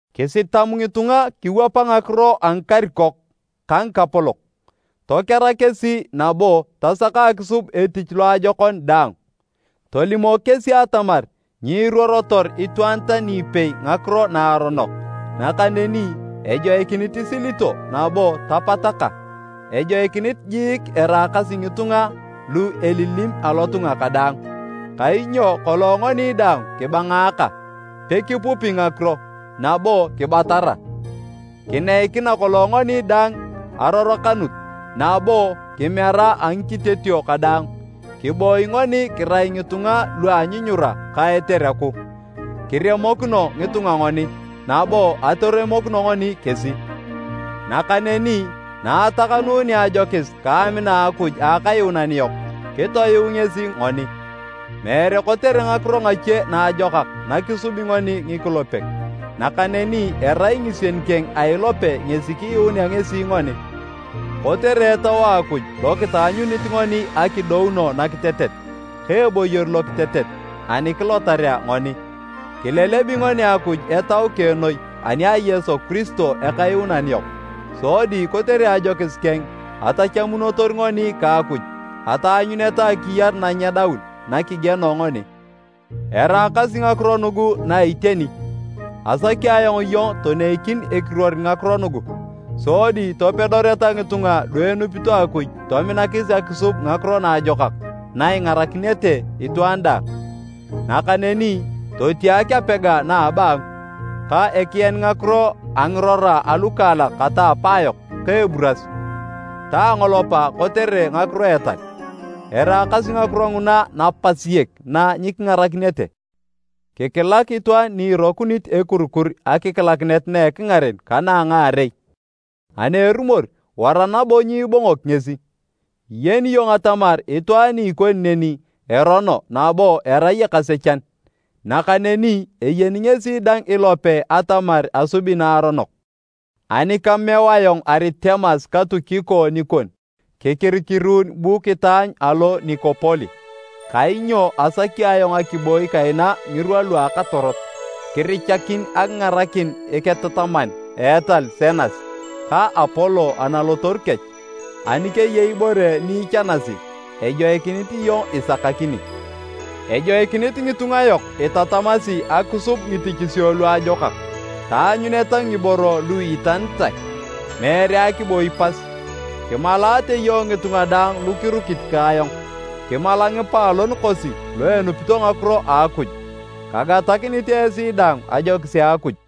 Kisitam ngitunga kiwapa ngakiro a ngikarikok ka ngikapolok, tokera kesi nabo tasaka akisub etich loajokon daang. Tolimok kesi atamar nyiruorotor itwaan tani ipei ngakiro naaronok, nakaneni ejoikinit isilito nabo tapataka. Ejoikinit jiik eraakasi ngitunga lu elilim alotunga kadaang. Kainyo kolong ngoni dang kibangaaka, pekipupi ngakiro, nabo kibatara. Kineikina kolong ngoni dang arorokanut nabo kimera a ngikitetio kadaang. Kiboi ngoni kirai ngitunga lu a anyunyura ka etereku, kiremokino ngitunga ngoni nabo atoremokino ngoni kesi. Nakaneni na atakanunea ajokis ka amina a Akuj a Akayuunan yok, kitoyuu ngesi ngoni. Meere kotere ngakiro ngache naajokak nakisubi ngoni ngikulepek, nakaneni erai ngisien keng a ilope ngesi kiyuunea ngesi ngoni, kotere Etau a Akuj lokitaanyunit ngoni akidouno nakitetet ka eboyor lokitetet ani kilotarea ngoni. Kilelebi ngoni Akuj Etau keng noi ani a Yesu Kiristo Ekayuunan yok, sodi kotere ajokis keng atachamunotor ngoni ka Akuj ataanyuneta akiyar nanyedaun nakigieno ngoni. Eraakasi ngakiro nugu na iteni. Asaki ayong iyong toneikin ekiruor ngakiro nugu, sodi topedoreta ngitunga lu enupito Akuj tominakis akisub ngakiro naajokak na ingarakinete itwaan daang. Nakaneni totiak apega na a abaangu, ka ekian ngakiro a ngirora alukaalak kata apaa yok ka eburas, ta angolopa kotere ngakiro a etal. Eraakasi ngakiro nguna napasiek na nyikingarakinete. Kikilak itwaan ni irokunit ekurikur akikilakinet na ekingaren ka na a ngaarei. Ani erumor, wara nabo nyiibongok ngesi. Iyeni iyong atamar itwaan ni ikoni neni erono nabo erai ekasechan, nakaneni eyeni ngesi dang ilope atamar asubi naaronok. Ani kameu ayong Aritemas ka Tukiko nikon, kikirikiruun bu kitaanyu alo Nikopoli, kainyo asaki ayong akiboi kaina ngirwa lua akatorot. Kirichakin akingarakin eketataman a etal Senas ka Apolo analotoru kech. Ani keyei ibore ni ichanasi, ejoikinit iyong isakakini. Ejoikinit ngitunga yok itatamasi akisub ngitichisio luajokak, taanyuneta ngiboro lu iitanitae, meere akiboi pas. Kimalaate iyong ngitunga daang lu kirukit ka ayong. Kimala ngipaalon kosi lu enupito ngakiro a Akuj. Kagatakinit esi daang ajokis a Akuj.